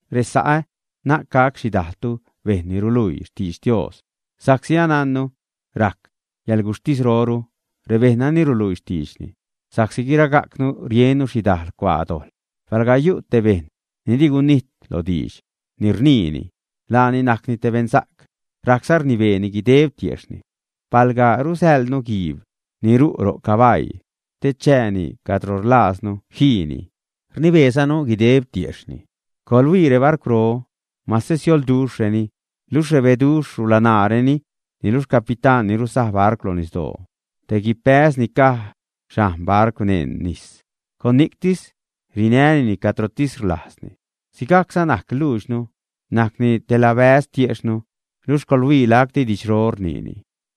Resa'ä, na'c gac xhidajltu bejṉ ni ruluii xtidx Dios, sa'csi anajnnu rac yäḻguxhtisroru rebejṉ nani ruluii xtiidxni. Sa'csi guiragajcnu riennu xhidajl cuaa dojḻ. Palga yu' te bejṉ ni di gunijt lo diidx ni rniini, laani najcni te beṉsa'c, rajcza rnibeeni guideb tiejxhni. Palga rusäḻnu guiib ni ru' ro' cabaii te chääni cadro rlajznu jiini, rnibeezanu guideb xtiejxhni. Coḻhuii rebarcwro, mase siolduxhreni, luxh rebeduxh rulanaareni, niluxh capitán ni rusaj barcw lo nisdoo, te guibbäz ni caj xhajn barcw neṉ nis, con ni'ctis rinänini cadrotis rlajzni. Sigajcza najc luudxnu, najcni te labäz tiejxhnu, luxh coḻhuii lacti didxro rniini.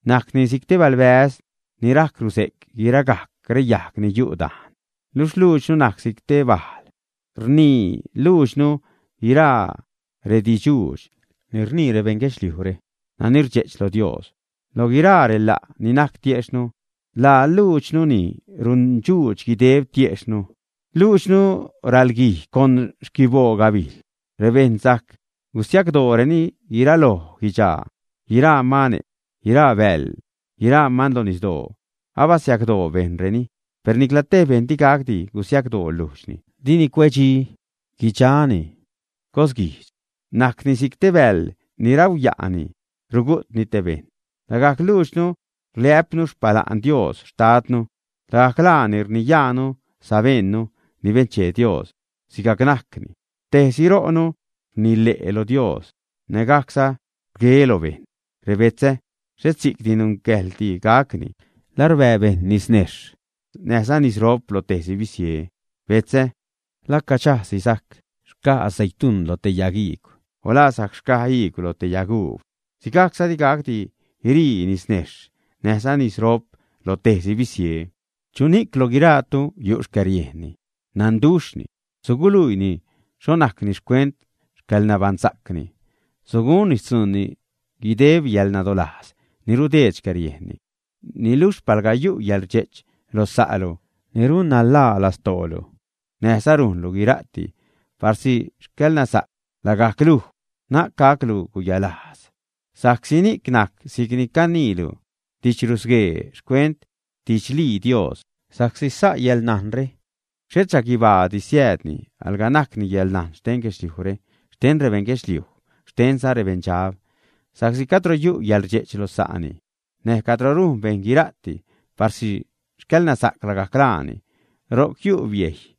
Najcni si'c te balbäz ni rajc ruze'c guiragajc reyajg ni yu' dajn. Luxh luudxnu najc si'c te bajl. Rnii luudxnu guiraa redidxdxuudx ni rnii rebeṉ guedxliujre nani rdxe'ch lo Dios. Lo guiraa rela' ni najc tiejxhnu, laa luuxdnu ni rundxuudx guideb tiejxhnu. Luudxnu ralguij con xquiboo gabijl. Rebejṉ sajc gusiacdooreni guiraloj guidxaa, guiraa mane', guiraa bäḻ, guiraa man lo nisdoo, abasiacdoo bejṉreni, per nicla tej bejṉ di gacdi gusiacdoo lujdxni. Dini cuedxi, guidxani cosguijdx, najcni si'c te bäḻ ni rauya'ni rugu'tni te bejṉ. Lagajc luudxnu rliä'pnu xpala'n Dios Xtadnu, lagajc laani rniyajnu sabejṉnu ni benchee Dios sigajc najcni. Tejsi ro'nu rnile' lo Dios nägajcza rgue lo bejṉ. Rebetzä, ¡xhet si'cdi nungäjḻdi gacni! ¿La rbää bejṉ nisnejxh näjza nisrop lo tejsi bisie, ä? Betzä, ¿la caxajsi sajc xcaj aceituṉ loj te yagiigw, ä? ¿O la sajc xcaj iigw lo te yaguub, ä? Sigajcza digacdi guirii nisnejxh näjza nisrop lo tejsi bisie. ¿Chuni'c lo guiraatu yu' xcäriejnni, nanduxhni, ä? Suguluiini xho najcni xcuent xcäḻnabaṉsa'cni, sugunni xtzuunni guideb yäḻnadolajz ni rudeed xcäriejnni. Niluxh palga yu' yäḻrdxe'ch lo sa'lu ni runnanḻaa lastoolu, näjza rujnlu guira'ti parsi xcäḻnasa'c lagajc luj, na'c gaclu guyalajz, sa'csi ni'c najc si'c ni caniilu didxrusguee xcuent xtidxlii Dios. Sa'csi sa' yäḻnajnre, xhet xhaguibaadi siäädni, alga najcni yäḻnajn xten guedxliujre, xten rebeṉ guedxliuj, xtenza rebeṉdxab. Sa'csi cadro yu' yäḻrdxe'ch lo sa'ni, näj cadro rujn bejṉ guira'ti parsi xcäḻnasa'c lagajc laani, ro'c yu' biejy,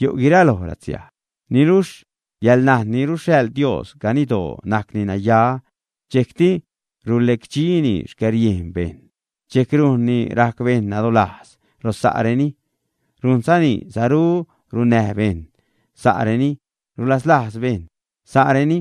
yu' guiraloj latsiaj. Niluxh yäḻnajn ni ruxhaḻ Dios, ganiddoo najcni naya, dxejcti rulecdxini xcäriejn bejṉ, dxejc rujnni rajc bejṉ nadolajz lo sa'reni, rujnzani saru runnäj bejṉ sa'reni, rulazlajz bejṉ sa'reni,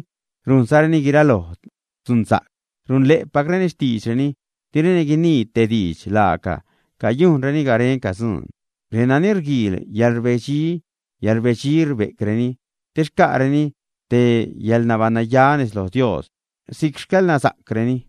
rujnzareni guiraloj dzunsa'c, runle'pacreni xtiidxreni, direni guinii tej diidx laaga cayujnreni garenca dzuun. Renani rguiil yäḻrbedxi, yäḻrbedxi rbe'creni te xca'reni te yäḻnabaṉnaya nez loj Dios si'c xcäḻnasa'creni.